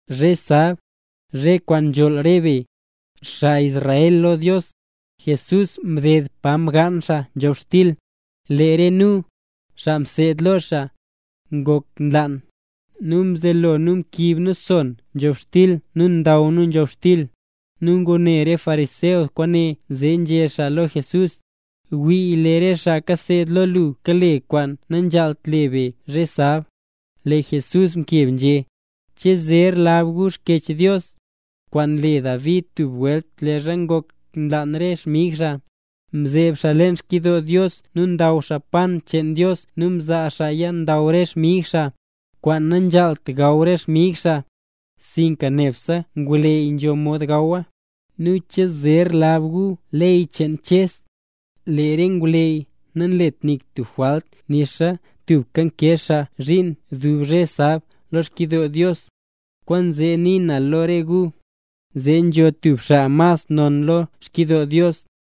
Zhe sab, zhe kwaan nzholl re be, xaa Israel lo Dios, Jesús mded pa mgaan xaa nzhobxtil. Lee re nu, xaa mseed lo xaa, ngok nlaan, nu mzelo nu mkiib nu son nzhobxtil nu ndaw nu nzhobxtil. Nu ngune re fariseo kwaane zee nzhé xaa lo Jesús: —Wii lee re xaa kaseed lo lu kale kwaan nanzhaalt le be zhe sab. Lee Jesús mkeb nzhé: —¿Che zer lab gu Xkyech Dios, kwaan mle David tub welt leezha ngok nlaan re xmig xaa? Mzeeb xaa leen xkyidoo Dios nu ndaw xaa pan cheen Dios nu mzaa xaaya ndaw re xmig xaa, kwaan nanzhaalt gaw re xmig xaa, sinka nebse ngwleyy nzho mod gawa. Nu, ¿che zer lab gu ley cheen Ches, lee re ngwleyy nanlet nik tub jwalt nixa tubka nkee xaa zhiin dub zhe sab lo xkyidoo Dios? Kwaanzee nii na lo re gu, nee nzho tub xaa mas non lo xkyidoo Dios.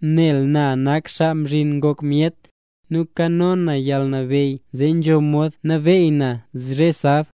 Nel na nak Xaa Mzhin Ngok Myet, nu nkano na yalnabeyy zee nzho mod nabeey na zhe sab.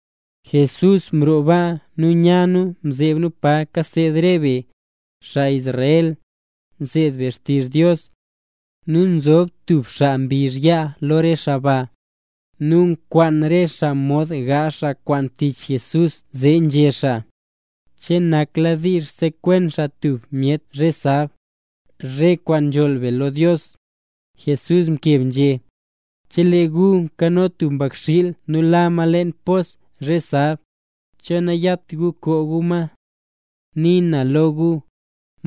Jesús mroo baa nu nya nu mzeeb nu pa nkasa re be, xaa Israel, nseed be xtizh Dios. Nu nzob tub xaa mbizh yaa lo re xaa ba. Nu nkwaan re xaa mod gaazh xaa kwaan tich Jesús zee nzhé xaa: —¿Che nakladiizh sekwen xaa tub myet zhe sab, zhe kwaan nzholl be lo Dios? Jesús mkeb nzhé: —Chelee tub gu nkano tub mbakxiil nu la ma leen pos zhe sab, ¿cho nayat gu koo gu ma? Nii na lo gu,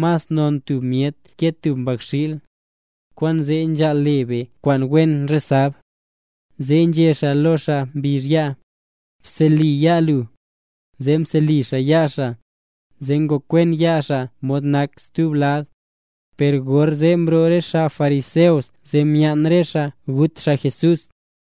mas non tub myet ke tub mbakxiil. Kwaanzee nzhaal le be kwaan wen zhe sab. Zee nzhé xaa lo xaa mbizh yaa: —Bseli yaa lu. Zee mseli xaa yaa xaa, zee ngokwen yaa xaa mod nak stub lad. Per gorzee mroo re xaa fariseo zee myaan re xaa gut xaa Jesús.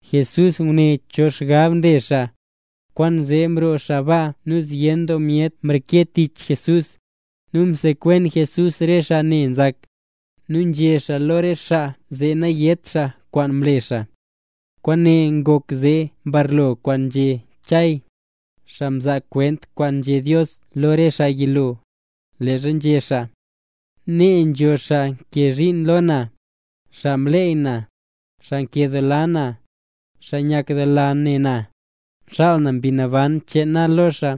Jesús ngune cho xgab mle xaa. Kwaanzee mroo xaa baa nu zyen doo myet mreke tich Jesús, nu msekwen Jesús rese xaa ne nzak. Nu nzhé xaa lo re xaa, zee nayét xaa kwaan mle xaa. Kwaane ngok zee mbarlo kwaan nzhé Chay, xaa mzaa kwent kwaan nzhé Dios lo lee xaa yilo, leezha nzhé xaa: Nee nzo xaa nkee zhiin lo na, xaa mleey na, xaa nkedoola na, xaa nyakdoola ne na, xaal na Mbi Naban cheen na lo xaa,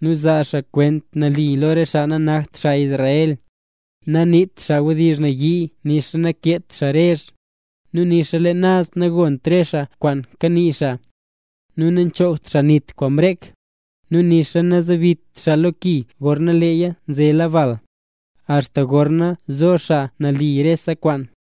nu zaa xaa kwent nali lo re xaa nanakt xaa Israel. Naniit xaa wdizh nayii nixa nakeet xaa rezh, nu nixa leen naz nagont re xaa kwaan kanii xaa. Nu nachoogt xaa nit kwaan mrek, nu nixa nazebit xaa lo ki gorna leeya zela bal, axta gorna zo xaa nali rese kwaan.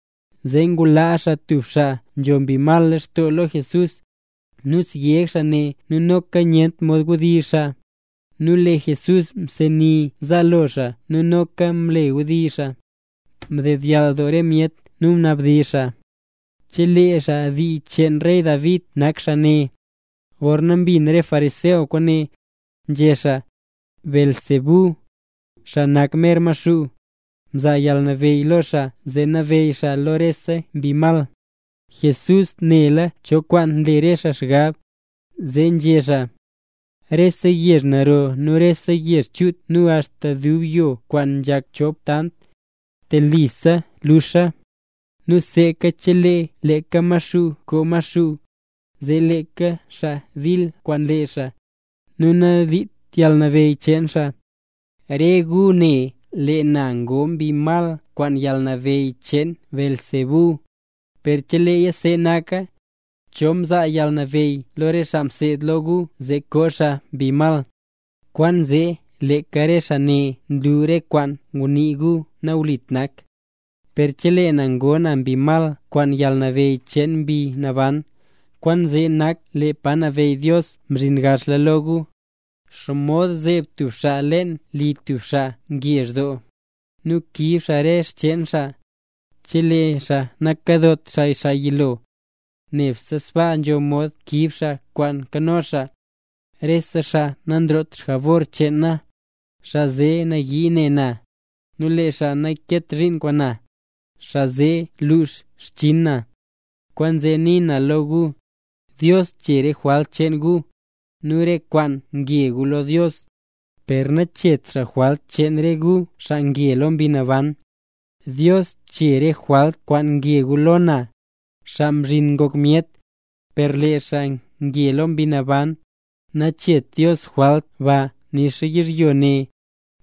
Zee ngulaa xaa tub xaa nzho mbi mal lextoo lo Jesús, nu syeg xaa ne, nu noka nyent mod wdizh xaa. Nu lee Jesús mseni zaalo xaa nu noka mle mbdizh xaa. Mdedyall doo re myet nu nabdizh xaa: —¿Che lee xaa dii cheen rey David nak xaa ne? Per gorna mbin re fariseo kwaane, nzhé xaa: —Beelzebú, xaa nak mer Maxuu, mzaa yalnabeyy lo xaa zee nabeyy xaa lo rese mbi mal. Jesús nela cho kwaan nle re xaa xgab, zee nzhé xaa: —Rese yezh naro nu rese yezh chut nu axta tub yoo kwaan nzhak chop tant, telisa luxa. Nu seeka chelee leeka Maxuu koo Maxuu, zee leeka lee xaa dil kwaan lee xaa, nu nadiit yalnabeyy cheen xaa. Re gu né, lee na ngoo mbi mal kwaan yalnabeyy cheen Beelzebú, per cheleeya see naka, ¿cho mzaa yalnabeyy lo re xaa mseed lo gu zee koo xaa mbi mal? Kwaanzee leeka re xaa ne nlu re kwaan ngunii gu nawlit nak. Per chelee na ngoo na mbi mal kwaan yalnabeyy cheen Mbi Naban, kwaane nak lee pa nabeyy Dios mzhin gaxla lo gu. ’¿Xomod zeeb tub xaa leen li tub xaa ngezh doo, nu kiib xaa re xcheen xaa, chelee xaa nakadot xaa xaa yilo? Nebse sbaa nzho mod kiib xaa kwaan nkano xaa. Re xaa nanroot jabor cheen na, xaa zee nayii ne na; nu lee xaa nankeet zhiin kwaan na, xaa zee nluux xchinn na. ’Kwaanzee nii na lo gu, Dios chee re jwalt cheen gu, nu re kwaan nge gu lo Dios, per nacheet xaa jwalt cheen re gu, xaa nge lo Mbi Naban. Dios chee axta re jwalt kwaan nge gu lo na, Xaa Mzhin Ngok Myet, per lee xaa nge lo Mbi Naban, nacheet Dios jwalt ba nixa yizhyo ne,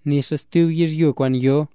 nixa stub yizhyo kwaan yo.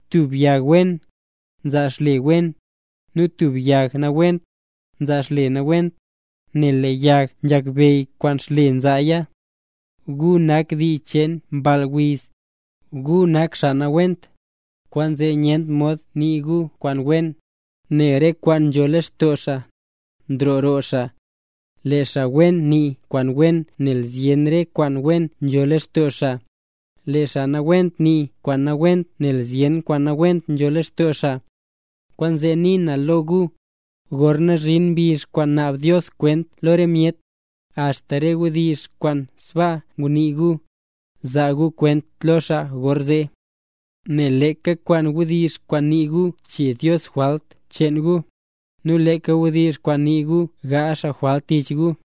’Tub yag wen, nzaa xle wen; nu tub yag nawent, nzaa xle nawent; nel lee yag nzhakbeyy kwaan xle nzaaya. ¡Gu nak dii cheen mball wiz! Gu nak xaa nawent, kwaanzee nyent mod nii gu kwaan wen; nel re kwaan nzho lextoo xaa, nroo roo xaa. Lee xaa wen nii kwaan wen nel zyen re kwaan wen nzho lextoo xaa, lee xaa nawent nii kwaan nawent nel zyen kwaan nawent nzho lextoo xaa. Kwaanzee nii na lo gu, gorna zhin mbizh kwaan naab Dios kwent lo re myet, axta re wdizh kwaan sbaasa ngunii gu, zaa gu kwent lo xaa gorzee. Nel leeka kwaan wdizh kwaan nii gu chee Dios jwalt cheen gu, nu leeka wdizh kwaan nii gu gaazh xaa jwalt tich gu.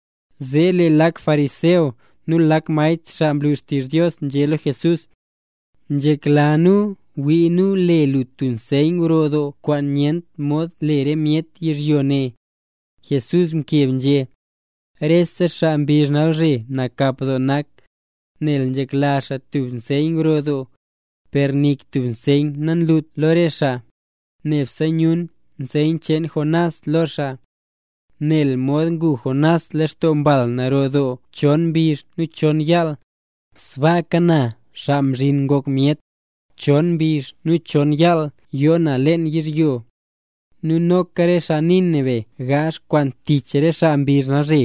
Zee lee lak fariseo nu lak maestr xaa nlu xtizh Dios nzhé lo Jesús: —Nzhekla nu wii nu le lu tub nseyn gro doo, kwaan nyent mod le re myet yizhyo ne. Jesús mkeb nzhé: —Rese xaa mbizh nalzhe nakap doo nak, nel nzhekla xaa tub nseyn gro doo, per nik tub nseyn nalut lo re xaa, nebse yun nseyn cheen Jonás lo xaa. Nel mod ngu Jonás lextoo mbal naro doo chon mbizh nu chon yaal, sbaaka na, Xaa Mzhin Ngok Myet, chon mbizh nu chon yaal yoo na leen yizhyo. Nu noka re xaa Nínive gaazh kwaan tich re xaa mbizh nalzhe,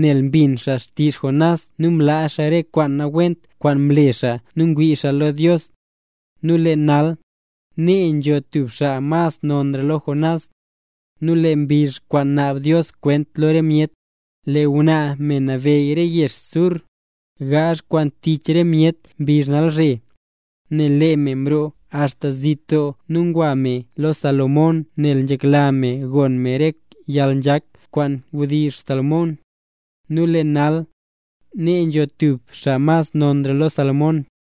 nel mbin xaa xtizh Jonás nu mlaa xaa re kwaan nawent kwaan mle xaa nu mwii xaa lo Dios. Nu lee nal, nee nzo tub xaa mas nonra lo Jonás. Nu lee mbizh kwaan naab Dios kwent lo re myet, lee ngwnaa, me mnabeyy Re Yezh Naz Sur, gaazh kwaan tich re myet mbizh nalzhe, nel lee me mroo axta zit doo nu ngwa me lo Salomón nel nzhekla me gon me re yalnzhak kwaan nzhedizh Salomón. Nu lee nal, nee nzo tub xaa mas nonra lo Salomón.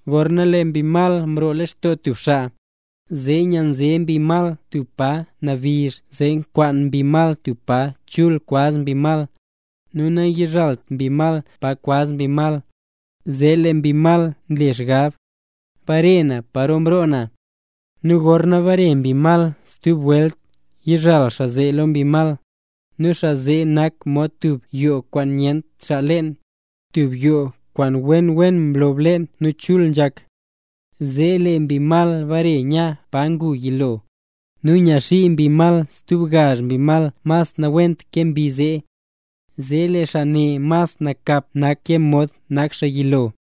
’Gorna lee mbi mal nroo lextoo tub xaa, zee nyanze mbi mal tub pa nabizh zee nkwaan mbi mal tub pa chul kwaz mbi mal, nu nayizhalt mbi mal pa kwaz mbi mal, zee lee mbi mal nle xgab: “Bare na paro mroo na”. Nu gorna mbare mbi mal stub welt, yizhal xaa zee lo mbi mal, nu xaa zee nak mod tub yoo kwaan nyent xaa leen, tub yoo kwaan wen wen mlob leen nu chul nzhak. Zee lee mbi mal mbare nya pa ngu yilo, nu nyaxii mbi mal stub gazh mbi mas nawent ke mbi zee. Zee lee xaa ne mas nakap nak ke mod nak xaa yilo.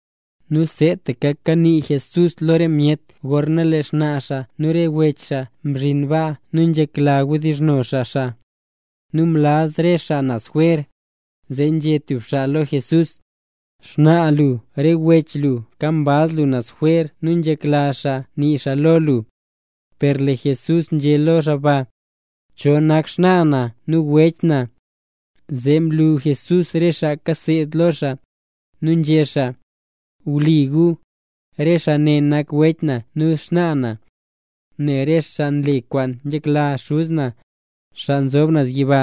Nu seetaka kanii Jesús lo re myet gorna lee xnaa xaa nu re wech xaa mzhin baa nu nzhekla wdizhno xaa xaa. Nu mlaz re xaa naz jwer. Zee nzhé tub xaa lo Jesús: —Xnaa lu nu re wech lu mkambaz lu naz jwer nu nzhekla xaa nii xaa lo lu. Per lee Jesús nzhé lo xaa ba: —¿Cho nak xnaa na nu wech na? Zee mlu Jesús re xaa mseed lo xaa, nu nzhé xaa: —Wii gu, re xaa ne nak wech na nu xnaa na. Nel re xaa nle kwaan nzhekla Xuz na, xaa nzob naz yiba,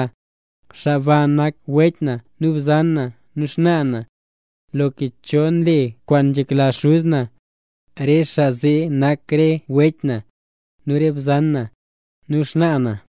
xaa baa nak wech na nu bzan na nu xnaa na. Loka cho nle kwaan nzhekla Xuz na, re xaa zee nak re wech na, nu re bzan na, nu xnaa na.